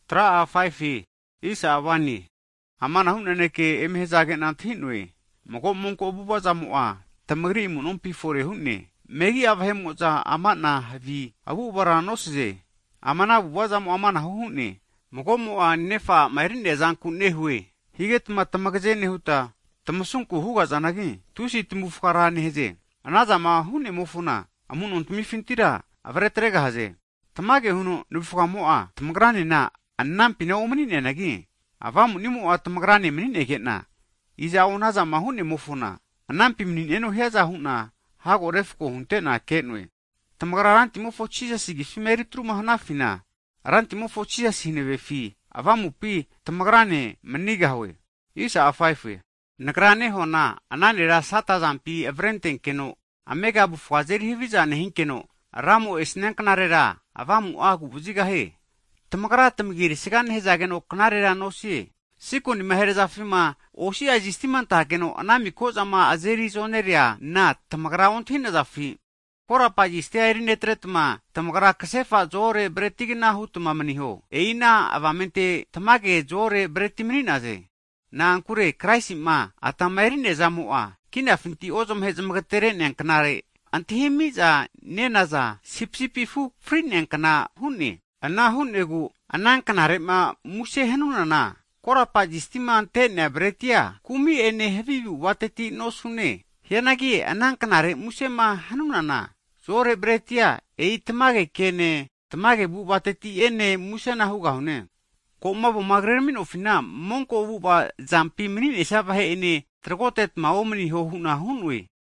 Hagi amanahu naneke eme hazage'na antahi'noe, mago monko avu'ava zamo'a tamagri amunompi fore hu'ne, megi'a vahe'mo'za amanahu havi avu'avara nosaze. Ama ana avu'avamo'a amanahu hu'ne, mago'mo'a nefa a'ma eri'neazanku nehue. Higetma tamagaze nehuta, tamasunku hugahazanagi, tusi tamavufga ra nehaze. Anazama hu'nemofona amu'nontmifintira avre atregahaze. Tamage huno navufgamo'a tamagranena anampina omani'noanagi, avamunimo'a tamagrane mani'nege'na, iza'o anazama hu'nemofona, anampi mani'neno hiaza hu'na hago refko hunte'na ke'noe. Tamagrama Rantimofo Jisasi agifima eritruma hanafina, Rantimofo Jisasi hanavefi avamupina tamagrane manigahue. Nagrama nehuana, ana nera Sata azampi avre atrenkeno amega avufga azeri haviza nehinkeno, Ramo'ma esnia knarera avamu'a agu'vazigahie. Tamagra tamagi erisaga nehazageno knarera nosie. Sikonima herazafima, osi'a zistima antageno ana mika'zama azeri zonereana tamagra ontahi'nazafi? Korapa zistia erinetretma, tamagra kasefa zo-ore bretigna hutma maniho. E'i ana avamente tamage zo-ore breti mani'naze. Na'ankure Kraisi'ma atama eri'nea zamo'a, kinafinti ozmahe zmagetere'nea knare'ma antahimi'za nenaza (Pasova) sipisipi afu fri'neankna hu'ne. Ana hu'negu ana knare'ma muse hanunana, korapa zistima ante'nea bretia, kumi'ene havi avu'avateti osanune. Hianagi ana knare musema hanunana, zo'ore bretia, e'i tamage kene, tamage avu'avateti'ene musena hugahune. Ko'ma avoma krerami'nofina monko avu'ava zampi mani'nesia vahe'ene tragotetma omaniho hu'na hu'noe.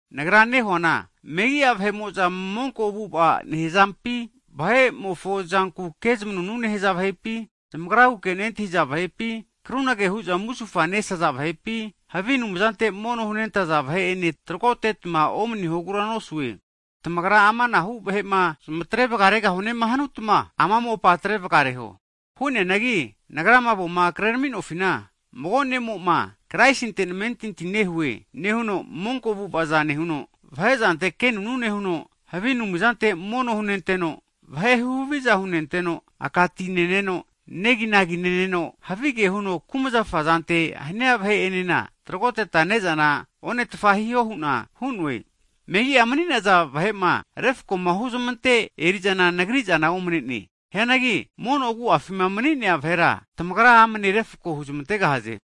Nagra nehuana megi'a vahe'mo'za monko avu'ava nehazampi, vahe'mofo zanku kezamanunu nehaza vahepi, zamagraguke nentahiza vahepi, krunage hu'za musufanesaza vahepi, havi anumzante mono hunentaza vahe'ene tragotetma omanihogura nosue. Tamagrama amanahu vahe'ma zamatre varegahunema hanutma, ama mopa atrevagareho. Hu'neanagi nagrama avoma krerami'nofina, mago ne'mo'ma Kraisinte namentinti nehue nehuno, monko avu'avaza nehuno, vahe zante kenunu nehuno, havi anumzante mono hunenteno, vahe huhaviza hunenteno, aka ti neno neginagi nehuno, havige huno kumzafa zante hania vahe'enena tragoteta ne'zana onetfa hiho hu'na hu'noe. Megi'a mani'naza vahe'ma refko'ma huzmante eri'zana nagri zana omne'ne. Hianagi mono agu'afima mani'nea vahera, tamagra amne refko huzmantegahaze.